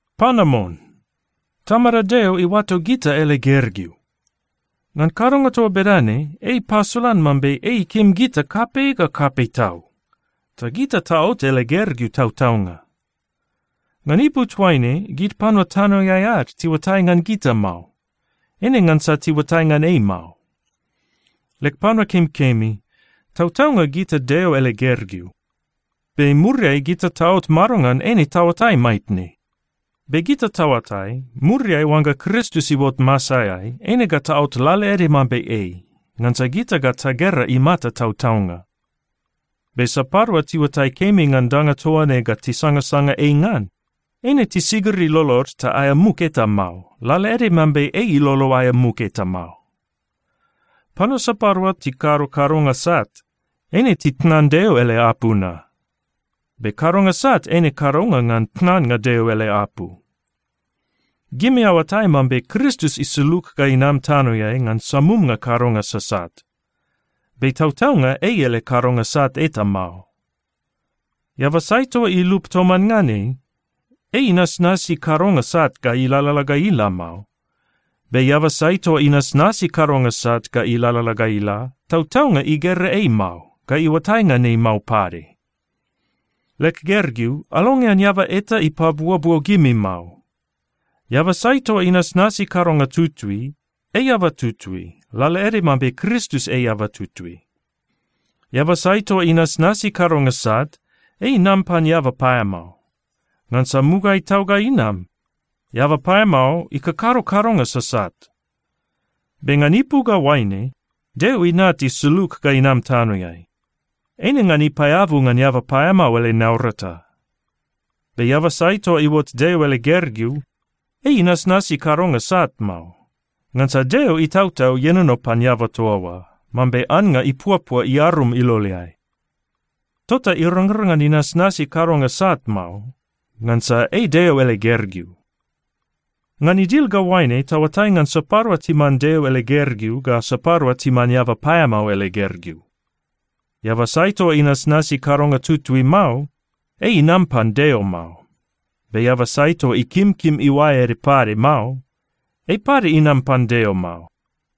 Panamon! Tamada Deo iuato gita ele gergeu! Ngan kadonga toa bedane, ei ipasolan mambe ei ikim gita kapei ga kapei tau. Ta gita taot ele gergeu tautaunga. Ngan ipu toaine, gid panua tanoeai ad tiuatai ngan gita mao, eine ngansa tiuatai ngan ei mao. Leg panua kemikemi, tautaunga gita Deo ele gergeu. Be muriai gita taot madongan, eine taoatai maitne. Be gita taoatai, muriai oangga Kristus iuot masaeai, eine ga taot lalaede mambe ei, ngansa gita ga tagera imata tautaunga. Be sapadua tiuatai kemi ngan danga toa ne ga tisangasanga ei ngan, eine tisigiri lolod ta aea muk eta mao, lalaede mambe ei ilolo aea muk eta mao. Panua sapadua tikado kadonga sat, eine titnan Deo ele apu na. Be kadonga sat eine kadonga ngan tnannga Deo ele apu. Gimi aoatai mambe Kristus isulug ga inam tanoeai ngan samumnga kadonga sasat. Be tautaunga ei ele kadonga sat eta mao. Eaba sai toa ilup toman ngan ei, ei inasnasi kadonga sat ga ilalala ga ila mao. Be eaba sai toa inasnasi kadonga sat ga ilalala ga ila, tautaunga igera ei mao, ga iuatai ngan ei mao pade. Leg gergeu, alongean eaba eta ipabuobuo gimi mao. Eaba sai toa inasnasi kadonga tutui, ei eaba tutui, lalaede mambe Kristus ei eaba tutui. Eaba sai toa inasnasi kadonga sat, ei inam pan eaba paeamao. Ngansa mugaeai tau ga inam, eaba paeamao ikakado kadonga sasat. Be ngan ipu ga oaine Deo Inat isulug ga inam tanoeai, eine ngan ipaeabu ngan eaba paeamao ele naurata. Be eaba sai toa iuot Deo ele gergeu, ei inasnasi kadonga sat mao. Ngansa Deo Itautau ienono pan eaba toa oa mambe annga ipuapua iarum iloleai. Tota irangrang ngan inasnasi kadonga sat mao, ngansa ei Deo ele gergeu. Ngan idil ga oaine taoatai ngan sapadua timan Deo ele gergeu ga sapadua timan eaba paeamao ele gergeu: Eaba sai toa inasnasi kadonga tutui mao, ei inam pan Deo mao. Be eaba sai toa ikimkim iuae ede pade mao, ei pade inam pan Deo mao.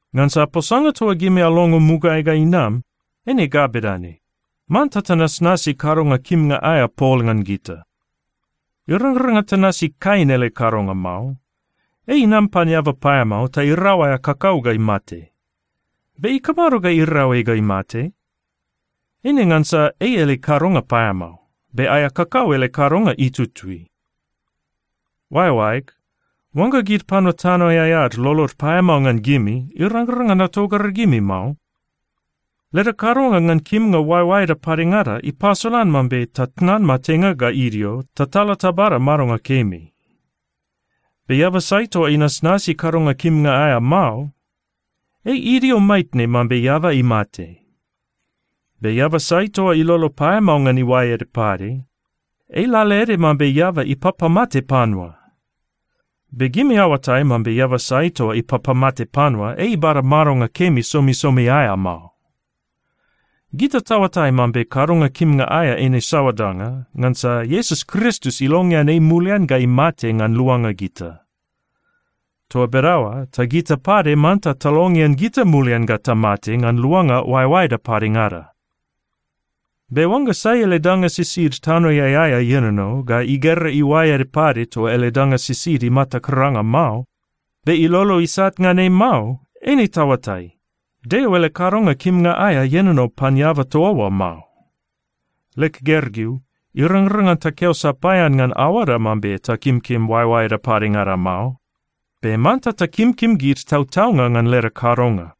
Ngansa posanga toa gimi alongo mugaeai ga inam, eine ga bedane: Manta tanasnasi kadonga kimnga aea pol ngan gita. Irangrang ngan tanasi Kain ele kadonga mao. Ei inam pan eaba paeamao ta irau aea kakau ga imate. Be ikamado ga irau ei ga imate? Eine ngansa ei ele kadonga paeamao, be aea kakau ele kadonga itutui. Oaeoaeg, oangga gid panua tanoeai ad lolod paeamao ngan gimi, irangrang ngan atogragimi mao. Leda kadonga ngan kimnga oaeoaeda padengada ipasolan mambe tatnan matenga ga idio, ta tala tabada madonga kemi. Be eaba sai toa inasnasi kadonga kimnga aea mao, ei idio maitne mambe eaba imate. Be eaba sai toa ilolo paeamao ngan iuae ede pade, ei lalaede mambe eaba ipapamate panua. Be gimi aoatai mambe eaba sai toa ipapamate panua, ei ibada madonga kemi somisomi aea mao. Gita taoatai mambe kadonga kimnga aea eine saoa danga, ngansa Iesus Kristus ilongean ei mulian ga imate ngan luanga gita. Toa bedaoa ta gita pade manta talongean gita mulian ga tamate ngan luanga oaeoaeda padengada. Be oangga sai ele danga sisid tanoeai aea ienono, ga igera iuae ede pade toa ele danga sisid imata karanga mao, be ilolo isat ngan ei mao, eine taoatai, Deo ele kadonga kimnga aea ienono pan eaba toa oa mao. Leg gergeu, irangrang ngan takeo sapaean ngan aoada mambe takimkim oaeoaeda padengada mao. Be manta takimkim gid tautaunga ngan leda kadonga.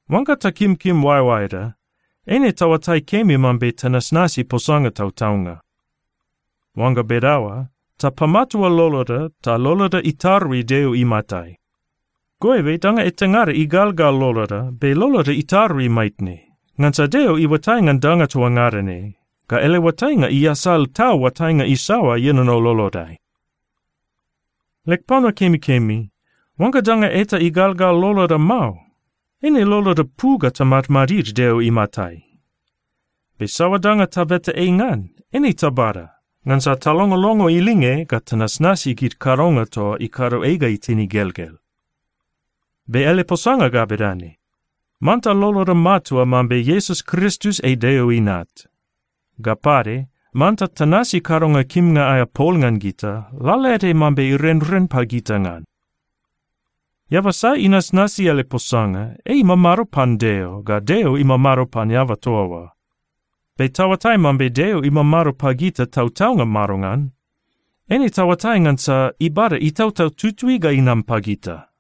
Oangga takimkim oaeoaeda, eine taoatai kemi mambe tanasnasi posanga tautaunga. Oangga bedaoa, tapamatua loloda ta loloda itarui Deo imatai. Goibe danga etangada igalgal loloda, be loloda itarui maitne, ngansa Deo iuatai ngan danga toa ngada ne, ga ele oatainga iasal tau oatainga isaoa ienono lolodai. Leg panua kemikemi, oangga danga eta igalgal loloda mao, eine loloda pu ga tamadmadid Deo imatai. Be saoa danga tabeta ei ngan, eine tabada, ngansa talongolongo ilinge ga tanasnasi gid kadonga toa ikado ei ga itin igelgel. Be ele posanga ga bedane: Manta loloda matua mambe Iesus Kristus ei Deo Inat. Ga pade, manta tanasi kadonga kimnga aea pol ngan gita, lalaede mambe irenren pagita ngan. Eaba sai inasnasi ele posanga, ei imamado pan Deo, ga Deo imamado pan eaba toa oa. Be taoatai mambe Deo imamado pagita tautaunga madongan? Eine taoatai ngansa ibada Itautau Tutui ga inam pagita.